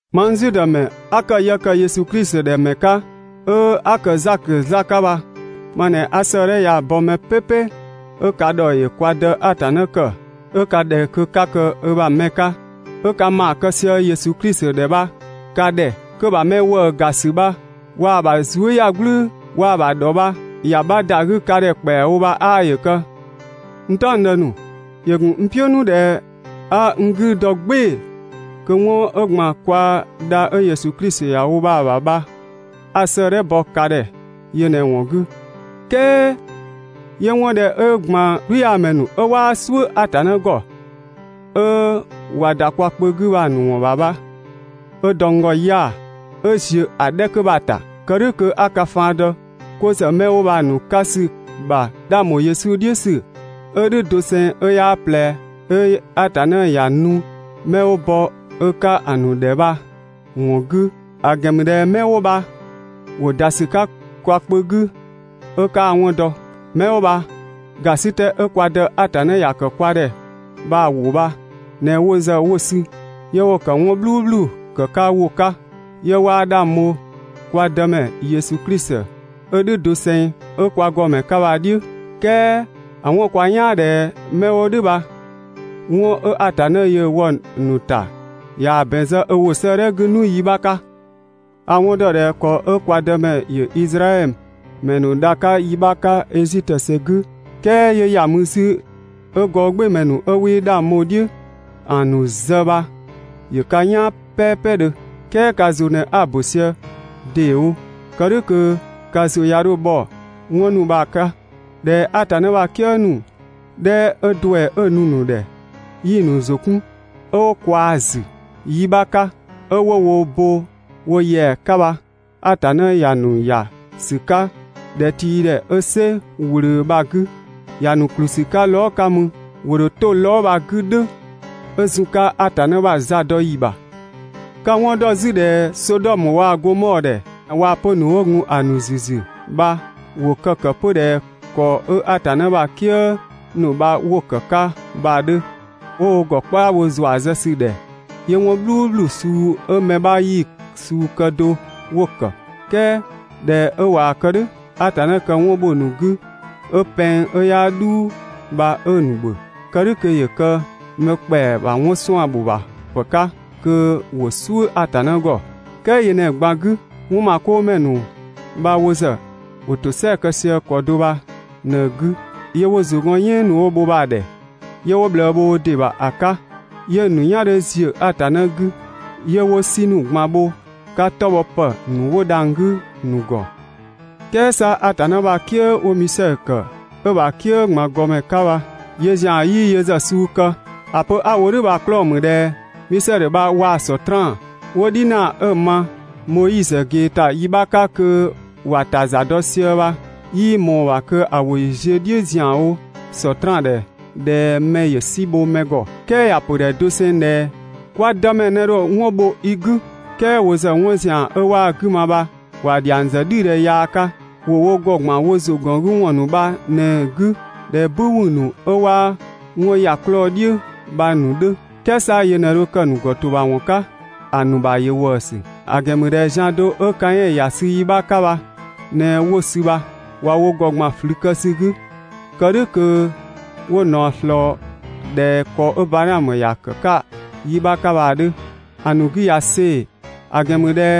Mang Zudë ‑mɛ 'a ‑kë yë ‑kë Yesu Klisi ‑dhɛ ‑mɛ 'ka, 'ö 'a ‑kë Zakö 'zlaa‑ 'ka bha ma ꞊në 'a 'sëëdhɛ ya‑ bɔ mɛ "pɛpɛ 'ö ka ‑dhɔ ‑yö kwa Dë Atanna ‑kë, 'ö ka ‑dhɛ kö 'ka kë ö ‑bha mɛ 'ka, 'ö ka ‑maa kë sië Yesu Klisi ‑dhɛ bha ka ‑dhɛ. Kö‑ ‑bha mɛ ‑wëëga ‑sü bha waa‑ ‑bha zuëyagblʋ̈ʋ̈‑, waa‑ ‑bha ‑dhɔ bha ‑ya 'bha ‑da 'gü ka ‑dhɛ ‑kpɛawo bha 'aa ‑yö kë! N "taɔngdë ‑nu, ‑yö gun n "piʋ̈ 'nu ꞊dhɛ 'a n 'gü dɔ "gbɩɩ‑ kö 'wɔn 'ö ‑gban kwa dha 'ö Yesu Klisi ‑ya wo bha‑ ‑bha bha 'a 'sëëdhɛ bɔ ka ‑dhɛ yö ꞊në‑ ‑wɔn 'gü. "Kɛɛ 'yö 'wɔn 'dhɛ 'ö ‑gban "gblüyaamɛ ‑nu 'ö 'waa "suʋ̈ Atanna ‑gɔ 'ö ꞊wa ‑da kwa kpö 'gü bha‑ ‑nu ‑wɔn ‑bha bha 'ö dɔ n ‑gɔ 'ya‑ 'ö ‑ziö ‑a 'dhɛ 'kö bha‑ ‑ta. Kë "dhʋ̈ kö 'a ka faan dɔ 'ko ‑zë 'mɛ 'wo bha‑ ‑nu 'ka ‑sü ‑bha 'dhang ‑bho Yesu "dhiʋ̈ ‑sü 'ö "dhʋ̈ doseng 'ö 'yaa ꞊plɛ, 'ö Atanna ‑ya nu 'mɛ 'wo bɔ ö 'ka ‑a ‑nu ‑dhɛ bha‑ ‑wɔn 'gü. ‑A ‑gɛn ‑mü ꞊dhɛ 'mɛ 'wo bha ‑wo ‑da ‑sü 'ka kwa kpö 'gü 'ö 'kaa‑ 'wɔn dɔ. 'Mɛ 'wo bha ‑gasitɛ 'ö kwa Dë Atanna ‑ya ‑kë kwa ‑dhɛ bha‑ ‑wʋ bha ꞊në wo ‑zë 'wo‑ sü 'yö 'wo‑ ‑kë 'wɔn "bhluubhlu kë‑ 'ka ‑wʋ 'ka, 'yö 'waa 'dhang bho kwa Dëmɛ Yesu Klisi 'ö "dhʋ̈ doseng, 'ö kwa ‑gɔmɛ 'ka bha‑ "dhiʋ̈. "Kɛɛ ‑a 'wɔn‑ kwa "yaan ꞊dhɛ 'mɛ 'wo "dhʋ̈ bha 'wɔn 'ö Atanna yöö‑ wɔ‑ ‑nu ‑ta ꞊yaa‑ ‑bɛn zë ö ‑wʋ 'sëëdhɛ 'gü 'nu yi 'bha 'ka. A‑ 'wɔn ‑dɔ ꞊dhɛ ‑kɔ 'ö kwa Dëmɛ ‑yö Izraɛdhö ‑mɛ ‑nu dha‑ 'ka yi 'bha 'ka Ezitö ‑sɛ 'gü, "kɛɛ 'yö ‑ya mü 'zü 'ö‑ gɔɔgbɩɩmɛ ‑nu 'ö 'wii 'dhang bho‑ "dhiʋ̈ ‑a ‑nu zë bha ‑yö ka "yaan "pɛɛpɛdhö. "Kɛɛ ka ‑zʋ ꞊në 'a‑ ‑bö sië ‑deewo. Kë "dhʋ̈ kö ka ‑zʋ 'ya 'dho bhɔ 'wɔn ‑nu bha‑ ‑nu 'ka. ꞊Dhɛ Atanna ‑bha "kië ‑nu 'dhɛ 'ö ‑duɛ 'ö‑ nu‑ ‑nu ‑dhɛ 'yii‑ ‑nu ‑zʋ 'kun 'ö 'wo ꞊kwaa‑ ‑zü yi 'bha 'ka, 'ö 'wo wo bo wo ‑yɛa 'ka bha Atanna ‑ya ‑nu ‑ya ‑sü 'ka ‑dhɛtiidhɛ 'ö "sɛ ꞊wlöö bha‑ 'gü, ‑ya ‑nu ‑kplü ‑sü 'ka lɔɔ" 'ka mü, ‑wo ‑dho 'to lɔɔ" bha‑ 'gü "dhʋ̈ 'ö zun‑ 'ka Atanna ‑bha za dɔ ‑yi ‑bha. Ka‑ 'wɔn ‑dɔ 'zü ꞊dhɛ Sodɔmö waa‑ Gomɔɔ ‑dhɛ waa‑ 'pö‑ ‑nu 'wo gun ‑a ‑nu ‑züzü bha ‑wo kë‑ ‑kë 'pö ꞊dhɛ ‑kɔ 'ö Atanna ‑bha "kië ‑nu bha 'wo‑ ‑kë 'ka bha‑ 'dhö, 'ö 'wo wo ‑gɔ "kpaa bho ‑zua zë ‑sü ‑dhɛ, 'yö 'wɔn "bhluubhlu suu 'ö mɛ 'bha 'yii‑ suu kë do 'wo‑ ‑kë. "Kɛɛ ꞊dhɛ 'ö ꞊waa‑ kë "dhʋ̈, Atanna kë 'wɔn bho‑ ‑nu 'gü 'ö pɛng 'ö 'yaa "dhuu bha 'ö‑ ‑nu ‑bhö. Kë "dhʋ̈ kö ‑yö kë mɛ ‑kpɛa ‑bha 'wɔn suan‑ ‑bho ‑bha ‑pë 'ka kö ‑wo "suʋ̈ Atanna ‑gɔ. "Kɛɛ yö ꞊në‑ ꞊gban 'gü, 'wɔnmakoomɛ ‑nu bha wo ‑zë ‑wo ‑tosɛa kë sië ‑kɔ do bha ꞊në‑ 'gü, 'yö 'wo ‑zʋ gɔn "yɛɛn ‑nu 'wo‑ bho bha‑ ‑dhɛ, 'yö 'wo ꞊bhlëë bho wo ‑dɩ ‑bha ‑a 'ka, 'yö‑ ‑nu "yan 'dhö ‑ziö Atanna 'gü, 'yö 'wo "sɩ ‑nu ꞊gban bho 'tɔ bhɔ ‑pë ‑nu 'wo dhang‑ 'gü‑ ‑nu ‑gɔ. "Kɛɛ 'sa Atanna ‑bha "kië 'wo‑ Misɛdhö ‑kë, 'ö‑ ‑bha "kië ꞊gban ‑gɔmɛ 'ka bha, yöö ‑zian 'yii yö ‑zë suu kë. ‑A pö 'a‑ wo "dhʋ̈ bha‑ 'klɔɔ‑ ‑mü ꞊dhɛ Misɛdhö bha waa‑ Sɔtraan 'wo "dhinaa 'ö‑ ma Moizö ꞊gee ‑ta yi 'bha 'ka kö ‑wa ‑ta za dɔ sië bha, 'yii ꞊mɔɔ‑ ‑bha kö‑ ‑wʋ ‑yö ziö‑ "dhiʋ̈ ‑zianwo Sɔtraan ‑dhɛ ꞊dhɛ mɛ ‑yö "si bho mɛ ‑gɔ. "Kɛɛ ‑ya pö ‑dhɛ doseng ꞊dhɛ: «Kwa Dëmɛ ꞊në dho ‑a bho i 'gü!» "Kɛɛ wo ‑zë 'wɔn ‑zian 'ö 'waa‑ 'gü ma bha ‑wa ‑dhiang ‑zë "dhidhɛ yaa 'ka. ‑Wo wo ‑gɔ ꞊gban wo ‑zʋgɔngüwɔn ‑nu bha ꞊në‑ 'gü ꞊dhɛ "bü wü ‑nu 'ö 'waa 'wɔn ‑ya 'klɔɔ‑ "dhiʋ̈ bha‑ ‑nu 'dhö. "Kɛɛ 'sa yö ꞊në dho kë‑ ‑nu ‑gɔtobhawɔn 'ka. ‑A ‑nu ‑bha ‑yö ‑wëësü. ‑A ‑gɛn ‑mü ꞊dhɛ zian do 'ö Kaɛn ‑ya sü yi 'bha 'ka bha ꞊në 'wo‑ sü bha. ꞊Wa wo ‑gɔ ‑gban ꞊flü kë ‑sü 'gü, kë "dhʋ̈ kö 'wo ꞊naɔ ꞊slɔɔ ꞊dhɛ ‑kɔ 'ö Badhaamö ‑ya ‑kë 'ka yi 'bha 'ka ‑a 'dhö. ‑A ‑nu 'gü ꞊ya see‑, ‑a ‑gɛn ‑mü ꞊dhɛ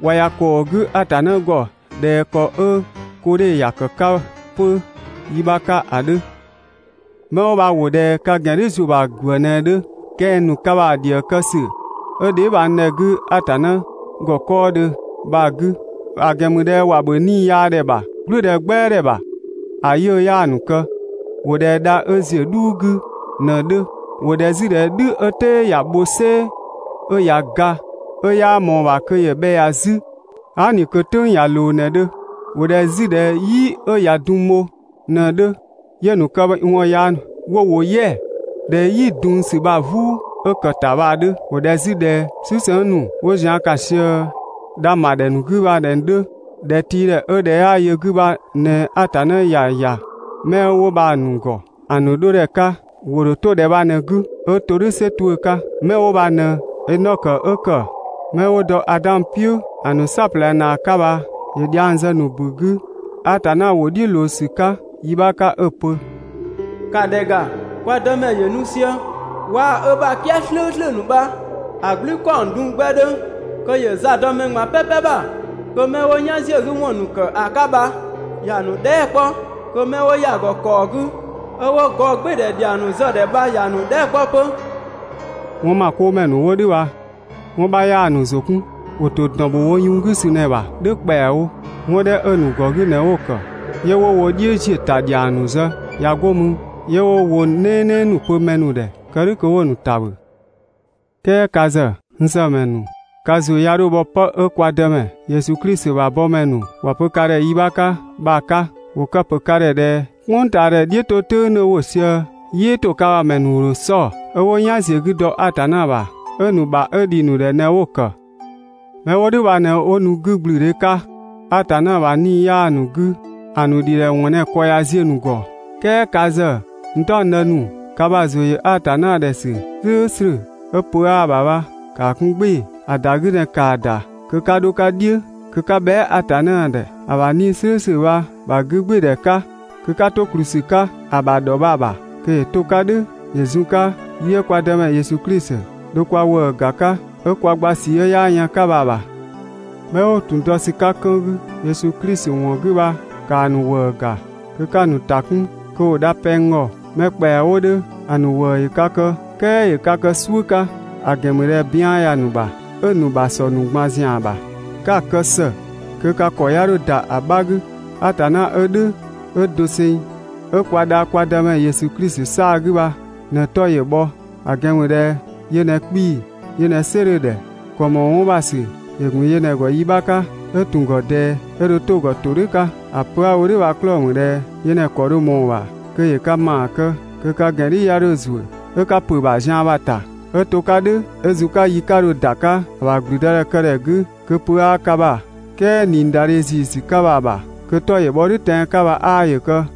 ꞊wa ‑ya ‑kɔɔ 'gü Atanna ‑gɔ ꞊dhɛ ‑kɔ 'ö Koodhe ‑ya ‑kë 'ka 'pö yi 'bha 'ka ‑a 'dhö. 'Mɛ 'wo bha ‑wo ꞊dhɛ ka ‑gɛn "dhiʋ̈ ‑zuö ‑bha ‑gwë ꞊në‑ 'dhö, kɛng‑ ‑nu ka ‑bha ‑dhië kë ‑sü 'ö dheebhang ‑dhɛ 'gü Atanna ‑gɔ 'kɔɔdhö bha‑ 'gü. ‑A ‑gɛn ‑mü ꞊dhɛ ‑wa ‑bhö 'niiyaadhɛ ‑bha "gblʋ̈ʋ̈dhɛ "gbɛadhɛ ‑bha, ‑a 'yiʋ̈‑ 'yaa‑ ‑nu kë, ‑wo ꞊dhɛ dha 'ö ‑ziö "dhuu 'gü ꞊në 'dhö, ‑wo ꞊dhɛ 'zü ꞊dhɛ "dhü 'ö "tɛɛ ꞊yaa‑ bho "sɛɛ 'ö ꞊ya ga, 'ö 'yaa ꞊mɔɔ‑ ‑bha kö ‑yö bhɛ ‑ya 'zü aa" ꞊ni kö‑ "tʋ̈ng ꞊ya ꞊loo ꞊në‑ 'dhö. ‑Wo ꞊dhɛ 'zü ꞊dhɛ "yi 'ö ꞊ya dunng bho ꞊në‑ 'dhö, 'yö‑ ‑nu këwɔn yaa ‑nu bha 'wo ‑wo "yɛa‑ ꞊dhɛ 'yi dunng ‑sü bha‑ "vuu 'ö ‑kë ‑ta bha‑ 'dhö. ‑Wo ꞊dhɛ 'zü ꞊dhɛ "susëng ‑nu 'wo zian ‑kan ꞊sië dhang‑ ‑bha ‑dhɛ ‑nu 'gü bha ꞊në‑ 'dhö. ‑Dhɛtiidhɛ 'ö ‑dhɛ 'yaa yö‑ 'gü bha ꞊në Atanna ‑ya ‑ya 'mɛ 'wo bha‑ ‑nu ‑gɔ ‑a ‑nu 'dho ‑dhɛ 'ka. ‑Wo ‑dho 'to ‑dhɛ bha ꞊në‑ 'gü 'ö to "dhʋ̈ "sɛ 'tuʋ̈‑ 'ka. 'Mɛ 'wo bha ꞊në Enɔkö 'ö ‑kë 'mɛ 'wo dɔ Adan "piʋ̈ ‑a ‑nu "saɔplɛ ‑naa 'ka bha ‑yö dhiang zë‑ ‑nu ‑bu 'gü Atanna ‑wʋ "dhiʋ̈ ꞊loo ‑sü 'ka yi 'bha 'ka 'ö‑ pö: «‑Ka ‑dhɛ ‑ga, kwa Dëmɛ ‑yö nu sië waa‑ ö ‑bha "kië "slʋ̈ʋ̈slʋ̈ ‑nu bha‑ "gblü ‑kaɔng dunng 'gbɛ 'dhö, kö ‑yö za dɔ mɛ ꞊gban "pɛpɛ ‑bha, kö 'mɛ 'wo "yan ‑ziö 'gü ‑wɔn ‑nu ‑kë ‑a 'ka bha ‑ya ‑nu dhɛɛ" 'kpɔ, kö 'mɛ 'wo ‑ya ‑gɔ ‑kaɔ 'gü 'ö 'wo gɔɔgbɩɩdhɛ ‑dhiang ‑nu zë‑ ‑dhɛ bha ‑ya ‑nu dhɛɛ" 'kpɔ 'pö. 'Wɔnmakoomɛ ‑nu 'wo "dhʋ̈ bha 'wɔn 'bha ‑wɔn 'bha 'yaa‑ ‑nu ‑zʋ 'kun, ‑wo ‑to ‑dɔn ‑bho wo yun 'gü ‑sü ꞊në‑ ‑bha "dhʋ̈ ‑kpɛawo, 'wɔn 'dhɛ 'ö‑ ‑nu ‑gɔ 'gü ꞊në 'wo‑ ‑kë, 'yö 'wo wo "dhiʋ̈ ‑ziö ‑ta ‑dhiang ‑nu zë, ꞊ya 'go mü 'yö 'wo ‑wʋ "nɛɛnɛɛ ‑nu pö mɛ ‑nu ‑dhɛ, kë "dhʋ̈ kö 'wo‑ ‑nu ‑ta ‑bhö. "Kɛɛ ka ‑zë, n ‑sëmɛ ‑nu, ka ‑zʋ 'ya 'dho bhɔ 'pë 'ö kwa Dëmɛ Yesu Klisi ‑bha bɔmɛ ‑nu ‑wa pö ka ‑dhɛ yi 'bha 'ka bha‑ 'ka. ‑Wo kë‑ ‑pö ka ‑dhɛ ꞊dhɛ: «"Kpʋngtaadhɛ "dhiʋ̈ 'to "tʋ̈ng 'dhö ‑wo sië, "yɩɩ ‑to ka ‑bha ‑mɛ ‑nu ‑dho 'sɔ‑, 'ö 'wo "yan ‑ziö 'gü dɔ Atanna ‑bha, 'ö‑ ‑nu ‑bha 'ö ‑dhi ‑nu ‑dhɛ ꞊në 'wo‑ ‑kë.» 'Mɛ 'wo "dhʋ̈ bha ꞊në 'wo nu 'gügblüdhe 'ka, Atanna ‑bha 'Nii‑ 'yaa‑ ‑nu 'gü. ‑A ‑nu ‑dhidhɛwɔn ꞊në‑ ‑kɔ ꞊ya ziö‑ ‑nu ‑gɔ. "Kɛɛ ka ‑zë, n "taɔngdë ‑nu, ka ‑bha ‑zʋ ‑yö Atanna ‑dhɛ ‑sü "slʋ̈ʋ̈slʋ̈ 'ö pö 'aa‑ ‑bha bha, ‑kaa 'kun "gbɩɩ‑, ‑a ‑da 'gü ꞊në ‑kaa ‑da kö 'ka 'dho‑ 'ka "dhiʋ̈, kö 'ka bhɛa" Atanna ‑dhɛ ‑a ‑bha 'Nii‑ "slʋ̈ʋ̈slʋ̈ bha‑ ‑bha 'gügbɩɩdhɛ 'ka. Kö 'ka 'to ‑kplü ‑sü 'ka‑ ‑bha ‑dhɔ bha‑ ‑bha kö ‑yö 'to‑ 'ka "dhʋ̈ ‑yö zun‑ 'ka yi 'ö kwa Dëmɛ Yesu Klisi dho kwa ‑wëë ‑ga 'ka 'ö kwa gba ꞊sii 'ö 'yaa yën‑ 'ka bha‑ ‑bha. 'Mɛ 'wo ‑tun dɔ ‑sü 'ka 'kën 'gü Yesu Klisi ‑wɔn 'gü bha ‑kaa ‑nu ‑wëë ‑ga kö 'ka‑ ‑nu ‑ta 'kun kö ‑wo dha pɛng ‑gɔ. Mɛ ‑kpɛa 'wo 'dhö ‑a ‑nu ‑wëë ‑yö ka kë, "kɛɛ ‑yö ka kë "suʋ̈ 'ka, ‑a ‑gɛn ‑mü ꞊dhɛ bian ‑ya ‑nu ‑bha 'ö‑ ‑nu ‑bha ‑sɔ ‑nu ꞊gban ‑bha. 'Ka‑ kë ‑së kö ka ‑kɔ 'ya 'dho ‑da ‑a 'bha 'gü. Atanna 'ö "dhʋ̈ 'ö doseng, 'ö kwa dha kwa Dëmɛ Yesu Klisi 'saa‑ 'gü bha ꞊në‑ 'tɔ ‑yö bhɔ, ‑a ‑gɛn ‑mü ꞊dhɛ yö ꞊në 'kpii‑, yö ꞊në "sɩ 'dhö‑ ‑dhɛ, ‑kɔ ‑mɔɔ 'wɔn ‑bha ‑sü ‑yö ‑gun ‑gɔ yi 'bha 'ka, 'ö ‑tun ‑gɔ ꞊dɛɛ, 'ö dho 'to‑ ‑gɔ ‑todhʋ̈ 'ka. ‑A pö 'a‑ wo "dhʋ̈ bha‑ 'klɔɔ‑ ‑mü ꞊dhɛ yö ꞊në‑ ‑kɔ dho ꞊mɔɔ‑ ‑bha kö ‑yö ka ‑maa kë kö ka ‑gɛn "dhiʋ̈ 'ya 'dho ‑zuö 'ö 'ka ‑pö ‑bha zian bha‑ ‑ta 'ö to‑ 'ka "dhʋ̈ 'ö zun‑ 'ka yi 'ka dho ‑da 'ka ‑a ‑bha ‑gblüdëdhɛkëdhɛ 'gü, kö pö 'aa ka ‑bha, "kɛɛ ꞊niidadhe ‑ziisü ka bha‑ ‑bha. Kö‑ 'tɔ ‑yö bhɔ "dhʋ̈ tɛan‑ 'ka bha 'aa ‑yö kë!